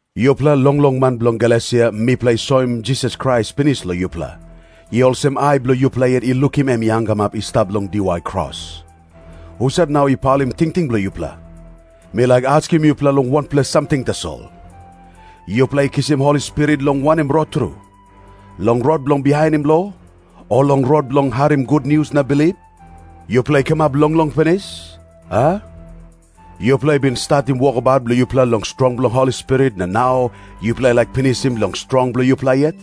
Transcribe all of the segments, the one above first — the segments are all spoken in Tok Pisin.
Yupela longlong man bilong Galesia, mipela i soim Jisas Krais pinis long yupela. I olsem ai bilong yupela yet i lukim em i hangamap i stap long diwai kros. Husat nau i paulim tingting bilong yupela? Mi laik askim yupela long wanpela samting tasol. Yupela i kisim Holi Spirit long wanem rot tru? Long rot bilong bihainim lo? O long rot bilong harim gutnius na bilip? Yupela i kamap longlong pinis, a? Yupela i bin statim wokabaut bilong yupela long strong bilong Holi Spirit, na nau yupela i laik pinisim long strong bilong yupela yet?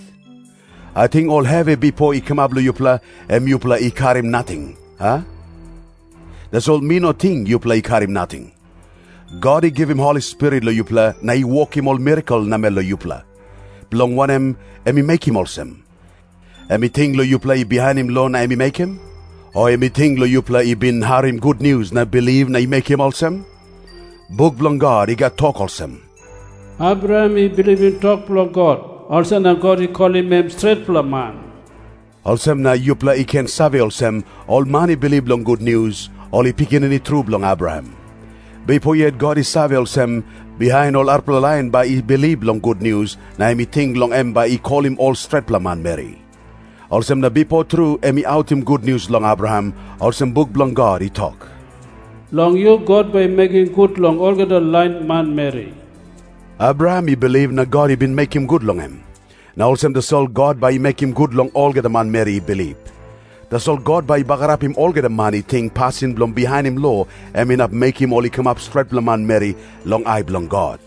Ating ol hevi bipo i kamap long yupela, em yupela i karim nating, a? Tasol mi no ting yupela i karim nating. God i givim Holi Spirit long yupela na i wokim ol mirakel namel long yupela. Bilong wanem em i mekim olsem? Em i ting long yupela i bihainim lo na em i mekim? O em i ting long yupela i bin harim gutnius na bilip na em i mekim olsem? Buk bilong God i gat tok olsem, "Abraham i bilipim tok bilong God, olsem na God i kolim em stretpela man." Olsem na yupela i ken save olsem, ol man i bilip long gutnius, ol i pikinini tru bilong Abraham. Bipo yet God i save olsem, bihain ol arapela lain bai i bilip long gutnius, na em i ting long em bai i kolim ol stretpela manmeri. Olsem na bipo tru em i autim gutnius long Abraham, olsem buk bilong God i tok, "Long yu God bai i mekim gut long olgeta lain manmeri." Abraham i bilip na God i bin mekim gut long em. Na olsem tasol God bai i mekim gut long olgeta manmeri i bilip. Tasol God bai i bagarapim olgeta man i ting pasin bilong bihainim lo em inap mekim ol i kamap stretpela manmeri long ai bilong God.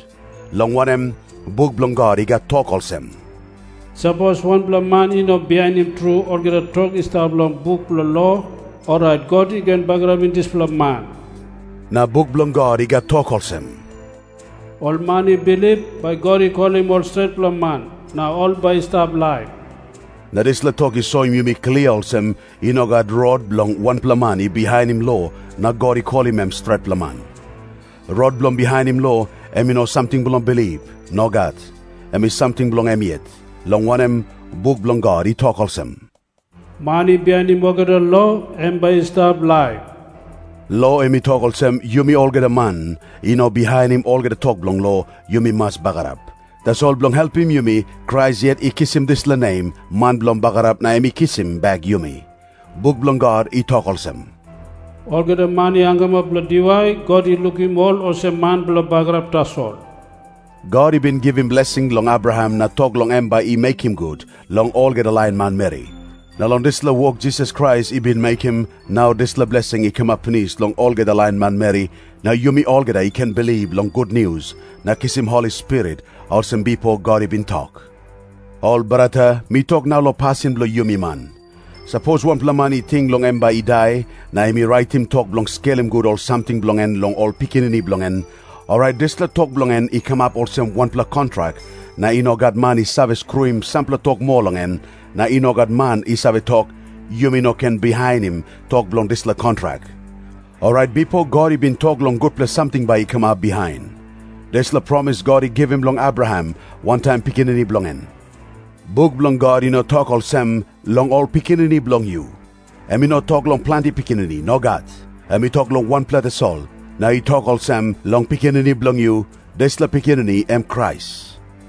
Long wanem, buk bilong God i gat tok olsem, "Sapos wanpela man i no bihainim tru olgeta tok i stap long buk bilong lo, orait God i ken bagarapim dispela man." Na buk bilong God i gat tok olsem, "Ol man i bilip, bai God i kolim ol stretpela man na ol bai i stap laip." Na dispela tok i soim yumi klia olsem, i no gat rot bilong wanpela man i bihainim lo na God i kolim em stretpela man. Rot bilong bihainim lo, em i no samting bilong bilip. Nogat. Em i samting bilong em yet. Long wanem, buk bilong God i tok olsem, "Man i bihainim olgeta lo, em bai i stap laip." Lo em i tok olsem, yumi olgeta man i no bihainim olgeta tok bilong lo, yumi mas bagarap. Tasol bilong helpim yumi, Krais yet i kisim dispela nem "man bilong bagarap" na em i kisim bek yumi. Buk bilong God i tok olsem, "Olgeta man i hangamap long diwai, God i lukim ol olsem man bilong bagarap tasol." God i bin givim blesing long Abraham na tok long em bai i mekim gut long olgeta lain manmeri. Na long dispela wok Jisas Krais i bin mekim, nau dispela blesing i kamap pinis long olgeta lain manmeri, na yumi olgeta i ken bilip long gutnius na kisim Holi Spirit, olsem bipo God i bin tok. Ol brata, mi tok nau long pasin bilong yumi man. Sapos wanpela man i ting long em bai i dai, na em i raitim tok bilong skelim gut ol samting bilong en long ol pikinini bilong en, orait dispela tok bilong en i kamap olsem wanpela kontrak, na i no gat man i save skruim sampela tok moa long en, na i no gat man i save tok, "Yumi no ken bihainim tok bilong dispela kontrak." Orait bipo God i bin tok long gutpela samting bai i kamap bihain. Dispela promis God i givim long Abraham wantaim pikinini bilong en. Buk bilong God i no tok olsem, "Long ol pikinini bilong yu." Em i no tok long planti pikinini. Nogat. Em i tok long wanpela tasol, na i tok olsem, "Long pikinini bilong yu." Dispela pikinini em Krais.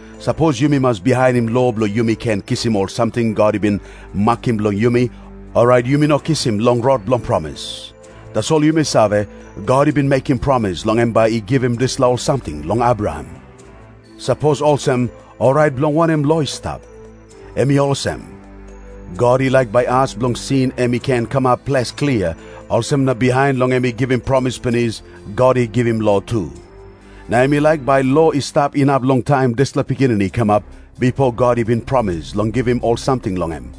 Sapos yumi mas bihainim lo bilong yumi ken kisim ol samting God i bin makim bilong yumi, orait yumi no kisim long rot bilong promis. Tasol yumi save, God i bin mekim promis long em bai i givim dispela ol samting long Abraham. Sapos olsem, orait bilong wanem lo i stap? Em i olsem. God i laik bai as bilong sin em i ken kamap ples klia, olsem na bihain long em i givim promis pinis, God i givim lo tu. Na em i laik bai lo i stap inap long taim dispela pikinini i kamap, bipo God i bin promis long givim ol samting long em.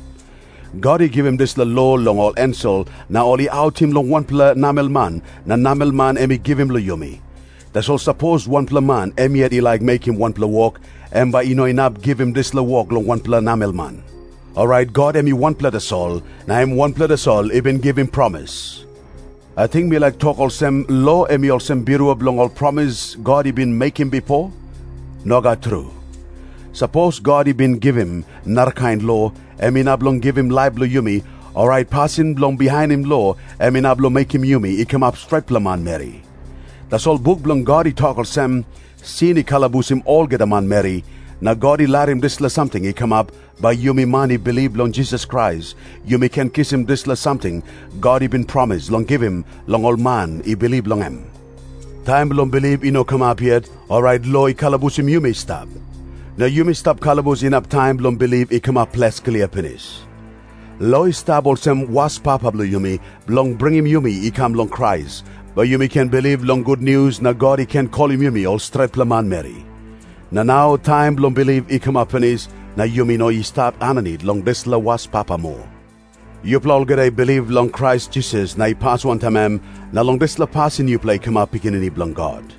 God i givim dispela lo long ol ensel na ol i autim long wanpela namelman na namelman em i givim long yumi. Tasol sapos wanpela man em yet i laik mekim wanpela wok, em bai i no inap givim dispela wok long wanpela namelman. Orait God em i wanpela tasol, na em wanpela tasol i bin givim promis. Ating mi laik tok olsem lo em i olsem birua bilong ol promis God i bin mekim bipo? Nogat tru. Sapos God i bin givim narakain lo, em inap long givim laip long yumi, orait pasin bilong bihainim lo em inap long mekim yumi i kamap stretpela manmeri. Tasol buk bilong God i tok olsem, "Sin i kalabusim olgeta manmeri," na God i larim dispela samting i kamap, bai yumi man i bilip long Jisas Krais yumi ken kisim dispela samting God i bin promis long givim long ol man i bilip long em. Taim bilong bilip i no kamap yet, orait lo i kalabusim yumi i stap. Na yumi stap kalabus inap taim bilong bilip i kamap ples klia pinis. Lo i stap olsem waspapa bilong yumi, bilong bringim yumi i kam long Krais, bai yumi ken bilip long gutnius na God i ken kolim yumi ol stretpela manmeri. Na nau taim bilong bilip i kamap pinis, na yumi no i stap aninit long dispela waspapa moa. Yupela olgeta i bilip long Krais Jisas na i pas wantaim em, na long dispela pasin yupela i kamap pikinini bilong God.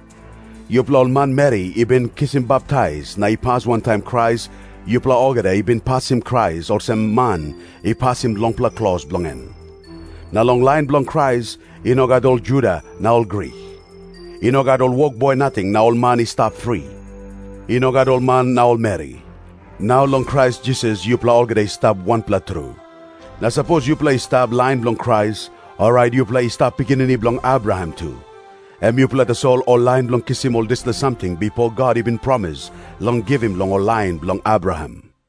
Yupela ol manmeri i bin kisim baptais na i pas wantaim Krais, yupela olgeta i bin pasim Krais olsem man i pasim longpela klos bilong en. Na long lain bilong Krais, i no gat ol Juda na ol Grik. I no gat ol wokboi nating na ol man i stap fri. I no gat ol man na ol meri. Nau long Krais Jisas yupela olgeta i stap wanpela tru. Na sapos yupela i stap lain bilong Krais, orait yupela i stap pikinini bilong Abraham tu. Em yupela tasol ol lain bilong kisim ol dispela samting bipo God i bin promis long givim long ol lain bilong Abraham.